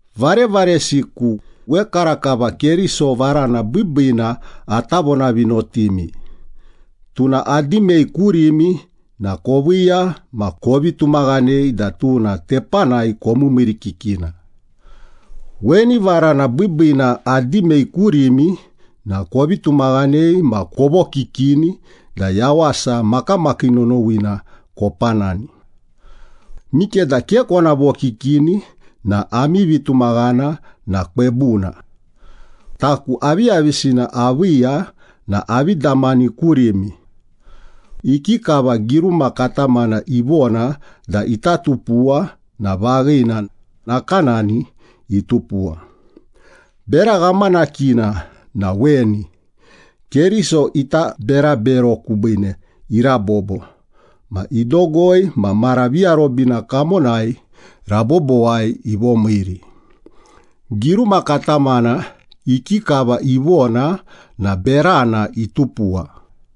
Varevaresiku, wekarakava Keriso varana biibiina ata vonavinotimi. Tuna adimei kurimi na koviiya ma kovi tumaghanei da tuna tepanai komiimiirikikina. Weni varana biibiina adimei kurimi na kovi tumaghanei ma kovokikini da yawasa makamakii nonowina kopanani. Mikeda ke kona vokikini na ami vitumaghana na kwebuna. Taku aviyavisina aviiya na avi damani kurimi. Ikikava giruma katamana ivona da ita tupuwa na vaghina, nakanani itupuwa. Bera ghamanakina na weni, Keriso ita berabero kubiine irabobo, ma idogoi ma mara viarobina kamonai rabobowai ivomiiri. Giruma katamana ikikava ivona na berana itupuwa.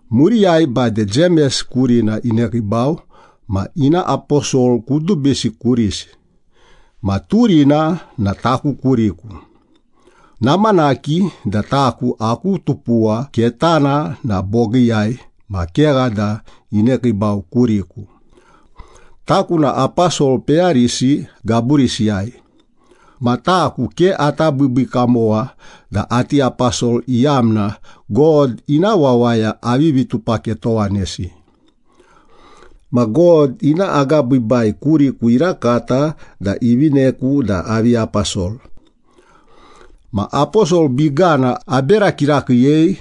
Muriyai bade Jemes kurina inekiibau, ma ina aposol kudubisi kurisi. Ma turina na taku kuriku. Namanaki da taku aku tupuwa ketana na bogiiyai ma kegha da inekiibau kuriku. Taku na aposol peyarisi gaburisiyai. Ma taku ke ata biibii kamowa da ati aposol iyamna God ina wawaya avivi tupaketowanesi. Ma God ina agabiibai kuriku irakata da ivineku da avi aposol. Ma aposol bigana abera kirakiiyei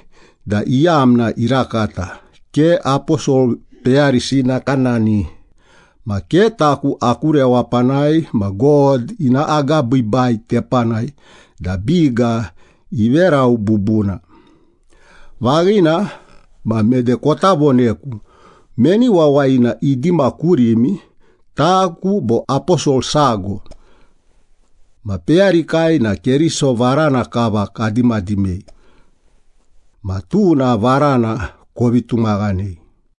da iyamna irakata, ke aposol peyarisi nakanani. Ma ke taku aku rewapanai ma God ina agabiibai tepanai da biga iverau bubuna. Vaghina ma, mede kota voneku meni wawayina idima kurimi, taku bo aposol sago. Ma peyarikai na Keriso varana kava kadimadimei. Ma tuna varana kovi tumaghanei.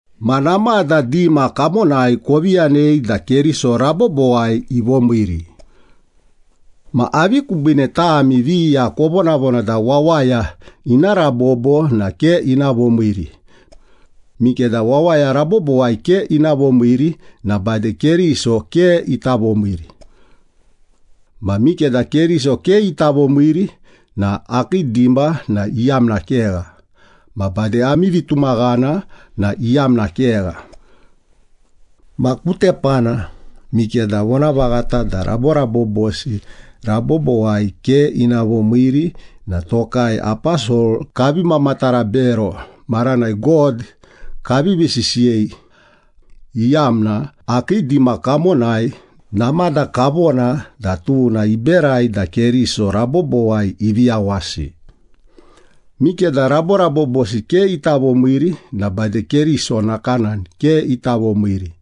Ma namada dima kamonai kovi yanei da Keriso rabobowai ivomiiri. Ma avi kubiine tami viya kovonavona da wawaya ina rabobo na ke ina vomiiri? Mikeda wawaya rabobowai ke ina vomiiri na bade Keriso ke ita vomiiri. Ma mikeda Keriso ke ita vomiiri na akii dima na iyamna kegha, ma bade ami vitumaghana na iyamna kegha. Ma ku tepana, mikeda vonavaghata da raborabobosi rabobowai ke ina vomiiri na tokai aposol kavi mamatara bero maranai God kavivi sisiyei, iyamna akii dima kamonai namada kavona da tuna iberai da Keriso rabobowai ivi yawasi. Mikeda raborabobosi ke ita vomiiri na bade Keriso nakanani ke ita vomiiri.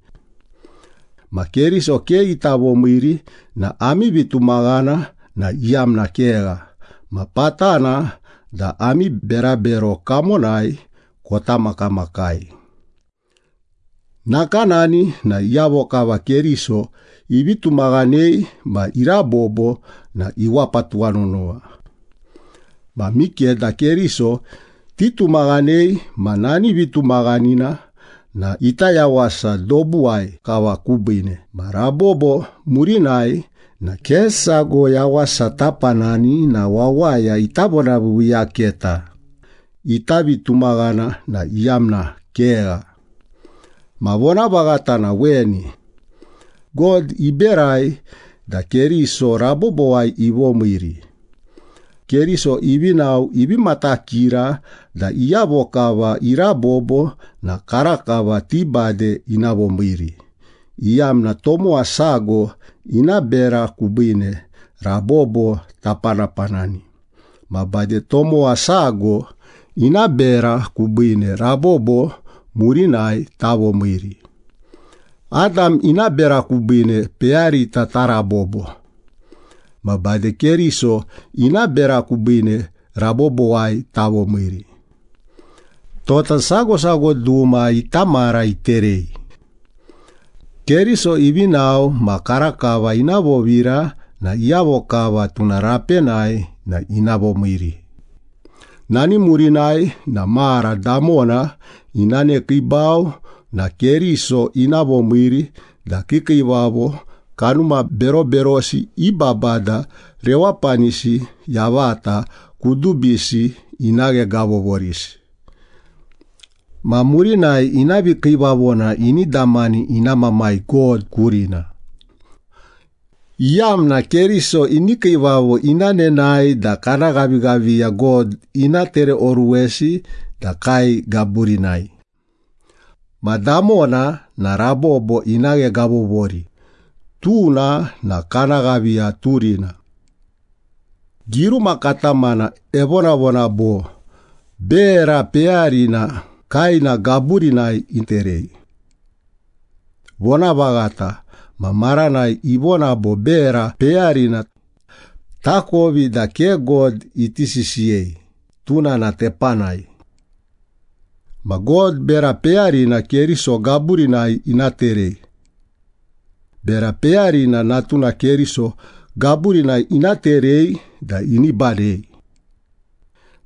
Ma Keriso ke ita vomiiri na ami vitumaghana na iyamna kegha, ma patana da ami berabero kamonai kota makamakai. Nakanani na iyavo kava Keriso ivi tumaghanei ma irabobo na iwapa tuwanonowa. Ma mikeda Keriso titumaghanei ma nani vitumaghanina na ita yawasa dobuwai kava kubiine ma rabobo murinai na ke sago yawasa tapanani na wawaya ita vonaviiviiyaketa, ita vitumaghana na iyamna kegha. Ma vonavaghata na weni. God iberai da Keriso rabobowai ivomiiri. Keriso ivi nao ivi matakira da iyavo kava irabobo na karakava ti bade ina vomiiri, iyamna tomowa sago ina bera kubiine rabobo tapanapanani, ma bade tomowa sago ina bera kubiine rabobo murinai tavomiiri. Adam ina bera kubiine peyarita tarabobo. Ma bade Keriso ina bera kubiine rabobowai tavomiiri. Tota sago sago duma ita mara iterei. Keriso ivi nao ma karakava ina vovira na iyavo kava tuna rapenai na ina vomiiri. Nani murinai na mara damona ina nekiibau na Keriso ina vomiiri da kiikiivavo, kanuma beroberosi i babada rewapanisi yavata kudubisi ina ghegavovorisi. Ma murinai ina vikiivavona ini damani ina Mamai God kurina, iyamna Keriso ini kiivavo ina nenae da kana ghavighaviya God ina tereoruwesi da kae gaburinai. Ma damona na rabobo ina ghegavovori, tuna na kana ghaviya turina. Giruma katamana evonavona bo, “Bera peyarina kaena gaburinai iterei.” Vonavaghata, ma maranai ivona bo ‘bera peyarina,’ takovi da ke God iti sisiyei, tuna na tepanai. Ma God bera peyarina Keriso gaburinai ina terei. Bera peyarina Natuna Keriso gaburinai ina terei da ini badei.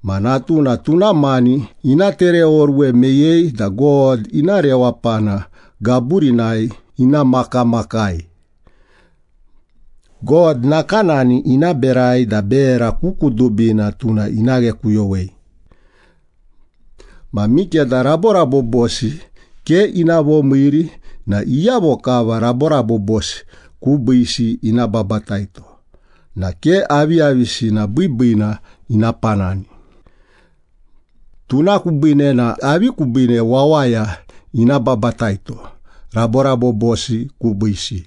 Ma Natuna tuna mani ina tereoruwe meyei da God ina rewapana gaburinai ina makamakai. God nakanani ina berai da bera ku kudubina tuna ina ghekuyowei. Ma mikeda raborabobosi ke ina vomiiri na iyavo kava raborabobosi kubiisi ina babataito na ke aviyavisina biibiina ina panani. Tuna kubiine na avi kubiine wawaya ina babataito raborabobosi kubiisi?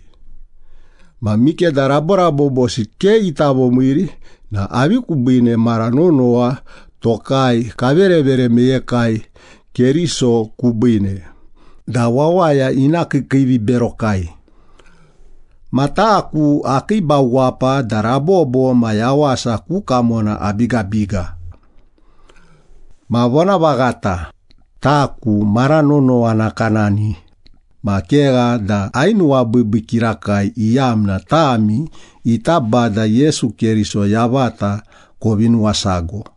Ma mikeda raborabobosi ke ita vomiiri na avi kubiine mara nonowa tokai kaverevere meyekai Keriso kubiine da wawaya ina kiikiiviberokai? Ma taku akiibau wapa da rabobo ma yawasa ku kamona abigabiga. Ma vonavaghata, taku mara nonowa nakanani, ma kegha da ainuwabiibii kirakai iyamna tami ita Bada Yesu Keriso yavata kovi nuwasago.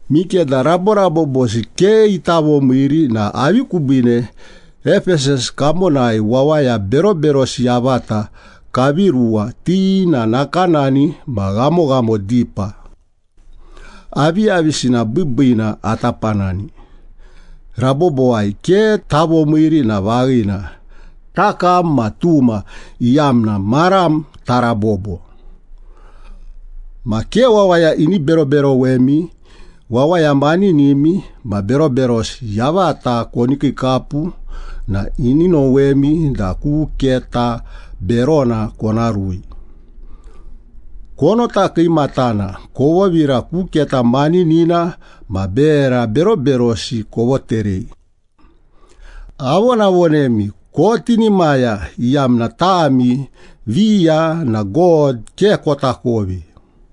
Mikeda raborabobosi ke ita vomiiri na avi kubiine Epesas kamonai wawaya beroberosi yavata kavi ruwa, ti na nakanani ma ghamoghamo dipa? Aviyavisina biibiina ata panani? Rabobowai ke tavomiiri na vaghina, “Takam ma tuma, iyamna maram tarabobo.” Ma ke wawaya ini beroberowemi, “Wawaya maninimi ma beroberosi yavata koni kiikapu na ini nowemi da ku keta berona kona rui.” Konota kiimatana, kovovira ku keta maninina ma bera beroberosi kovoterei. Avonavonemi, kotinimaya, iyamna tami viya na God ke kotakovi.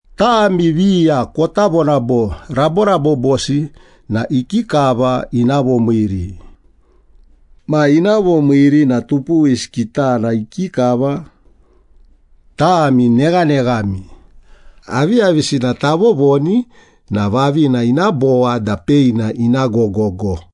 Tami viya kota vona bo, “Raborabobosi na ikikava ina vomiiri? Ma, ina vomiiri na tupuwisi kitana ikikava?” Tami neghaneghami! Aviyavisina tavovoni na vavina ina bowa da peina ina gogogo.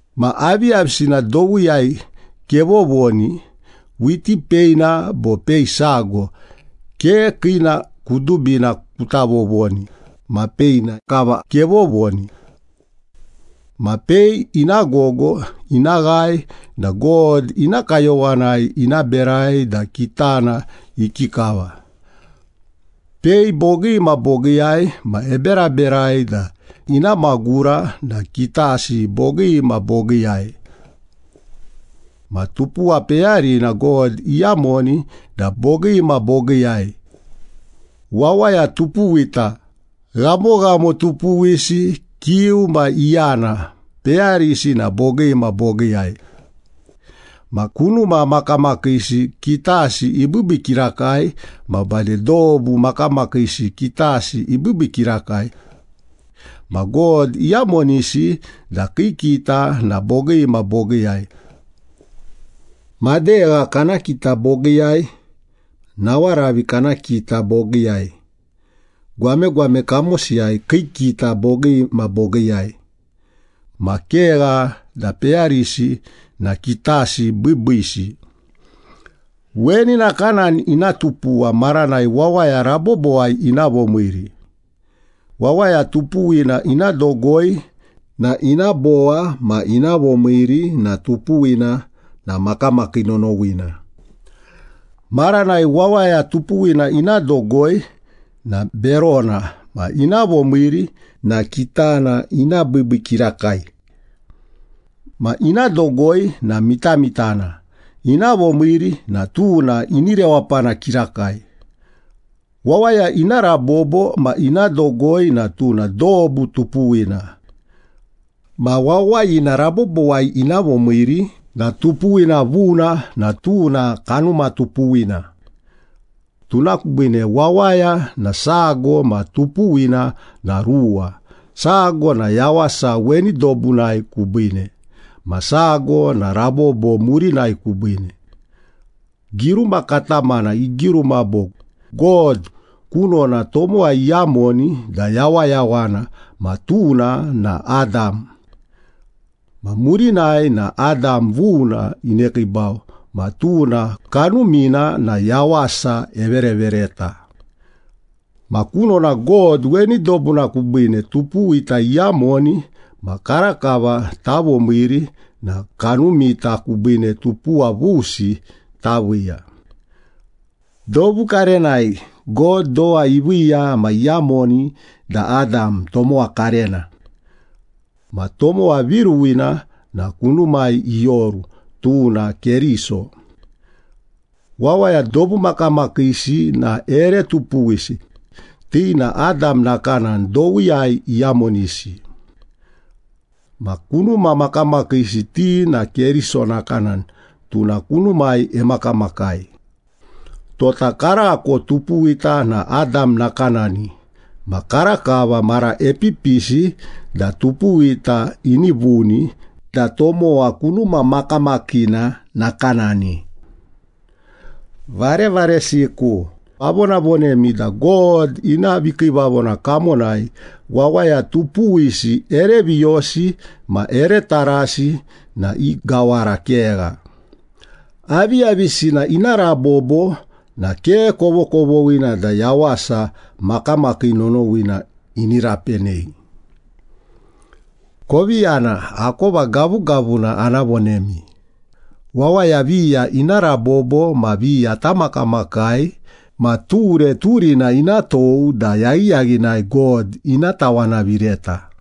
Ma aviyavisina dowiyai kevovoni, whiti peina bo pei sago, ke kiina kudubina kuta vovoni ma peina kava kevovoni. Ma pei ina gogo ina ghae na God ina kayowanai ina berai da kitana ikikava. Pei bogii ma bogiiyai ma eberaberai da ina magura na kitasi bogii ma bogiiyai. Ma tupuwa peyarina God iyamoni da bogii ma bogiiyai. Wawaya tupuwita, ghamoghamo tupuwisi, kiu ma iyana, peyarisi na bogii ma bogiiyai. Ma kunuma makamakiisi kitasi ibiibii kirakai ma bade dobu makamakiisi kitasi ibiibii kirakai. Ma God iyamonisi da kii kita na bogii ma bogiiyai. Madegha kana kita bogiiyai, nawaravi kana kita bogiiyai, gwamegwame kamosiyai kii kita bogii ma bogiiyai. Ma kegha da peyarisi na kitasi biibiisi. Weni nakanani ina tupuwa maranai wawaya rabobowai ina vomiiri. Wawaya tupuwina ina dogoi na ina bowa ma ina vomiiri na tupuwina na makamakii nonowina. Maranai wawaya tupuwina ina dogoi na berona, ma ina vomiiri na kitana ina biibii kirakai. Ma ina dogoi na mitamitana, ina vomiiri na tuna ini rewapana kirakai. Wawaya ina rabobo ma ina dogoi na tuna dobu tupuwina. Ma wawayina rabobowai ina vomiiri na tupuwina vuna na tuna kanuma tupuwina. Tuna kubiine wawaya na sago ma tupuwina na ruwa, sago na yawasa weni dobunai kubiine ma sago na rabobo murinai kubiine. Giruma katamana igiruma bo, “God kunona tomowa iyamoni da yawayawana, ma tuna na Adam.” Ma murinai na Adam vuna inekiibau ma tuna Kanumina na yawasa everevereta. Ma kunona God weni dobuna kubiine tupuwita iyamoni ma karakava tavomiiri na kanumita kubiine tupuwa vusi taviiya. Dobu karenai God dowa iviiya ma iyamoni da Adam, tomowa karena. Ma tomowa viruwina na kunumai ioru, tuna Keriso. Wawaya dobu makamakiisi na ere tupuwisi, ti na Adam nakanani dowiyai iyamonisi. Ma kunuma makamakiisi ti na Keriso nakanani, tuna kunumai emakamakai. Tota karako tupuwita na Adam nakanani ma karakava mara epipisi da tupuwita ini vuni da tomowa kunuma makamakina nakanani. Varevaresiku, avonavonemi da God ina vikiivavona kamonai wawaya tupuwisi ere viyosi ma ere tarasi na i gawara kegha. Aviyavisina ina rabobo na ke kovokovoghina da yawasa makamakii nonowina ini rapenei. Kovi yana, akova gavugavuna ana vonemi. Wawaya viya ina rabobo ma viya tamakamakai ma ture turina ina tou da yaghiyaghinai God ina tawanavireta.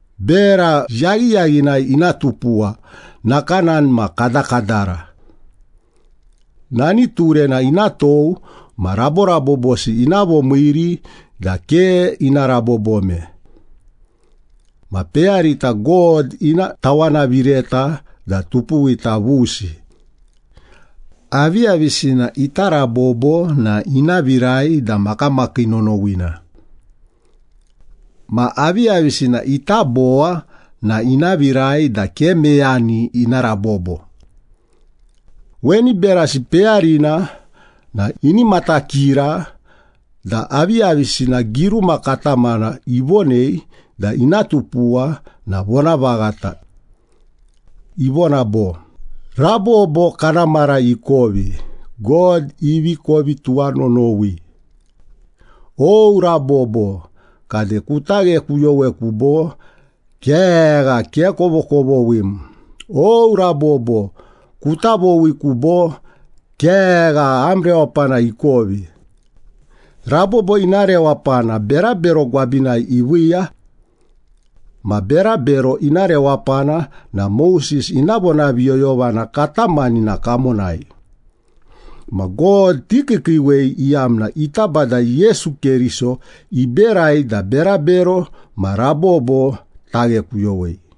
Bera yaghiyaghinai ina tupuwa, nakanani ma kadakadara. Nani turena ina tou ma raborabobosi ina vomiiri da ke ina rabobome. Ma peyarita God ina tawanavireta da tupuwita vusi. Aviyavisina ita rabobo na ina virai da makamakii nonowina. Ma aviyavisina ita bowa na ina virai da ke meyani ina rabobo. Weni berasi peyarina na ini matakira da aviyavisina giruma katamana ivonei da ina tupuwa na vonavaghata. Ivona bo, “Rabobo kana mara ikovi, God ivi kovi tuwanonowi. O, rabobo kade kuta ghekuyoweku bo? Kegha, ke kovokovoghim! O, rabobo kuta vowiku, bo? Kegha, am rewapana ikovi!” Rabobo ina rewapana berabero gwabinai iviiya. Ma berabero ina rewapana na Moses ina vonaviyoyovana katamanina kamonai. Ma God tikiikiiwei, iyamna ita Bada Yesu Keriso iberai da berabero ma rabobo taghekuyowei.